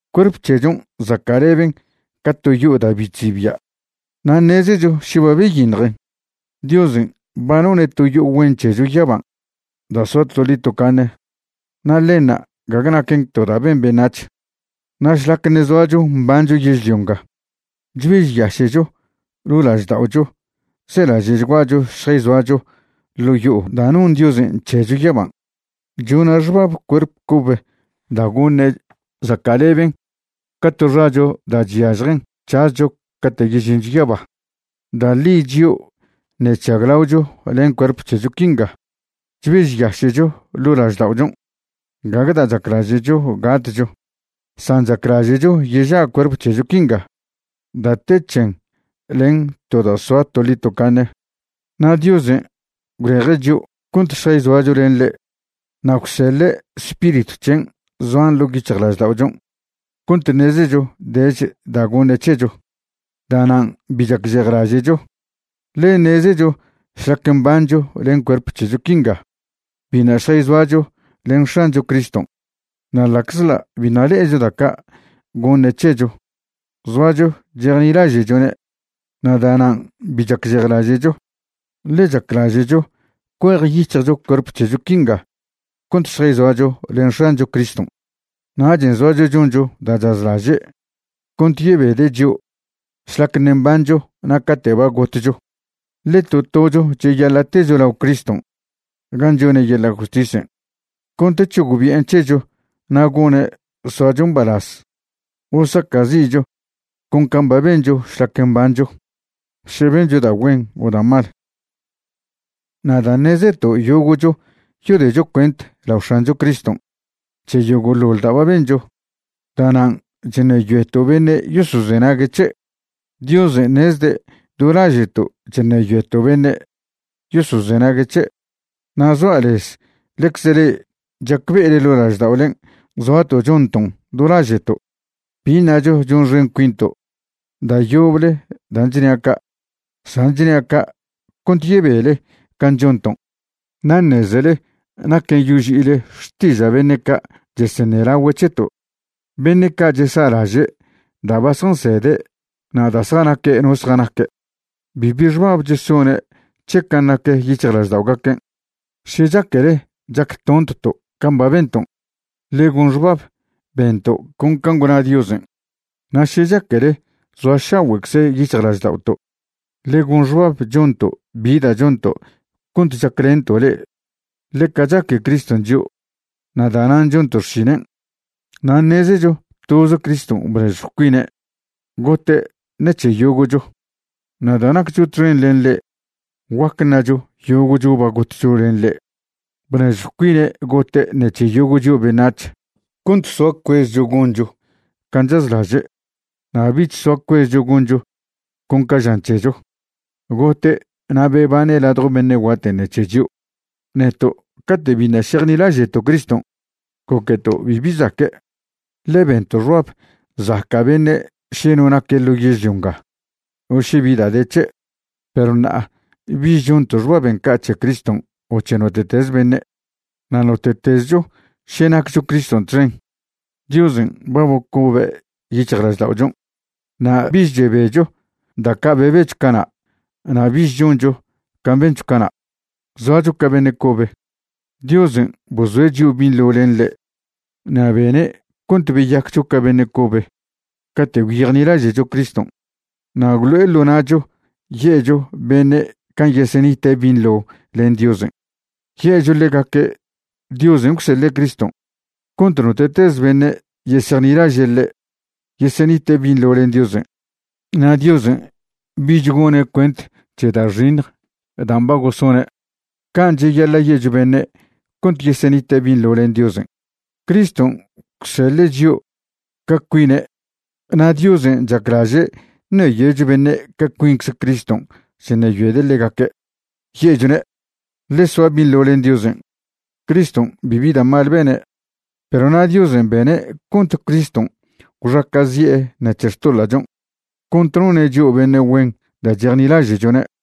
Cuerp c̱hechon' zaca'leben ca to yo'o da' bi chzibia'. Na' ṉezecho še ba byiṉjen, Diosen' ba none' to yo'o güen c̱hecho yaban' da' soa toḻi tocaṉe; na' ḻenṉa' gague naquen to da' ben beṉac̱h. Na' šlac ṉe' zoacho mbancho yežlio nga, chbežyaše'cho ḻo' lažda'ocho zelaže'chguacho šjayzoacho ḻo' yo'o da' non Diosen' c̱hecho yaban'. Chona' xbab cuerp c̱obe da' goṉe' zaca'leben ca to xacho da' chyažjen c̱hazcho cate' yežincho yaba. Da' ḻi chio' ṉe' chžaglaocho len cuerp c̱hecho quinga chbežyaše'cho ḻo' lažda'ochon'. Gague da' chaclaže'cho gatcho, san chaclaže'cho yeža' cuerp c̱hecho quinga da' te c̱hen len to da' soa toḻi tocaṉe. Na' Diosen' gwleje' chio' cont šjayzoacho len ḻe' na' gwseḻe' Spiritw c̱hen' zoan ḻo' yic̱hjlažda'ochon' cont ṉezecho dech da' goṉe' c̱hecho. Da'nan' bi chacžejlaže'cho, ḻe ṉezecho šlac mbancho len cuerp c̱hecho quinga biṉa' šjayzoacho len X̱ancho Criston'. Na' ḻa'czḻa' biṉa' le'echo da' ca' goṉe' c̱hecho, zoacho chejnilaže'chone'. Na' da'nan' bi chacžejlaže'cho, ḻe chaclaže'cho cuejyic̱hjcho cuerp c̱hecho quinga cont šjayzoacho len X̱ancho Criston'. Nachen' zoacho choncho da' chazlaže' cont yebede' chio' šlac ṉe' mbancho na' cate' ba gotcho. Ḻe to tocho cheyaḻa' techo lao Criston' gan' chone' yeḻa' justisen' cont c̱hogbi'en c̱hecho na' gone' soacho mbalaz o saca'zi'cho con can' ba bencho šlac mbancho, še bencho da' güen o da' mal. Na' dan' ṉezeto' yogo'cho yodecho cuent lao X̱ancho Criston' c̱he yogo'ḻoḻ da' ba bencho, da'nan' chṉeyoeto' beṉe' yosozenague' c̱he'. Diosen' ṉezde' do laže'to' chṉeyoeto' beṉe' yosozenague' c̱he', na' zoa' lez ḻecze le'e chacbe'ele ḻo' lažda'olen' zoato' chonton' do laže'to'. Bi ṉacho chonxen cuinto' da' yoble dan' chnia' ca', san chnia' ca' cont yebele can' chonton' na' ṉezele naquen' yoži'ile xtiža' beṉe' ca' cheseṉelagüe' c̱heto'. Beṉe' ca' chesa'laže' da' ba zjansede' na' da' zjanaque' no zjanaque'. Bibi xbab chesone' c̱he can' nac yic̱hjlažda'ogaquen'. Še chaquele chactontto' can' ba benton', ḻe gon xbab bento' con can' gwna Diosen'. Na' še chaquele zoašagüe'cze yic̱hjlažda'oto', ḻe gon xbab chonto' bi da' chonto' cont chaclento' le'e. Ḻeca chaque Criston' chio' na' da'nan' chonto' xšinen'. Na' ṉezecho toz Criston' bnežjw cuine' gote' ṉec̱he yogo'cho, na' da' naccho txen len ḻe' guac ṉacho yogo'cho ba gotcho len ḻe'. Bnežjw cuine' gote' ṉec̱he yogo' chio' beṉac̱h, cont soa cuezcho goncho can' chazlaže' na' bich soa cuezcho goncho con ca žan c̱hecho. Gote' na' bebane' ladjo beṉe' guaten' ṉec̱he chio'. Neto' cate' biṉa' šejnilaže'to' Criston' goqueto' bibi zaque', ḻe bento' xbab zaca' beṉe' še no naque' ḻo yežlio nga o še bi da' de c̱he'. Perw ṉa'a bich chonto' xbaben' ca' c̱he Criston' o c̱he note'teze beṉe'. Na' note'tezcho še naccho Criston' txen, Diosen' ba bocobe' yic̱hjlažda'ochon'. Na' bich chebecho da' ca' bebecho cana' na' bich choncho can' bencho cana'. Zoacho ca beṉe' cobe. Diosen' bozoe' chio' binḻo len ḻe' na' bene' cont beyaccho ca beṉe' cobe cate' gwyejnilaže'cho Criston'. Na' gwlo'e ḻo na'cho ye'cho beṉe' can' yesenite' binḻo len Diosen'. Ye'cho ḻegaque' Diosen' gwseḻe' Criston' cont note'teze beṉe' yesejnilaže' ḻe' yesenite' binḻo len Diosen', na' Diosen' bich gone' cuent c̱he da' xiṉj dan' ba gosone'. Can' cheyaḻa' ye'cho beṉe' cont yesenite' binḻo len Diosen'. Criston' gwseḻe' chio' ca cuine' na' Diosen' chaclaže' ṉeyoecho beṉe' ca cuincze Criston' chṉeyoede' ḻegaque', ye'chone': “Ḻe soa binḻo len Diosen'.” Criston' bibi da' mal bene'. Perw na' Diosen' bene' cont Criston' gwxaca'zi'e ṉec̱he xtoḻa'chon' cont none' chio' beṉe' güen da' chejnilaže'chone'.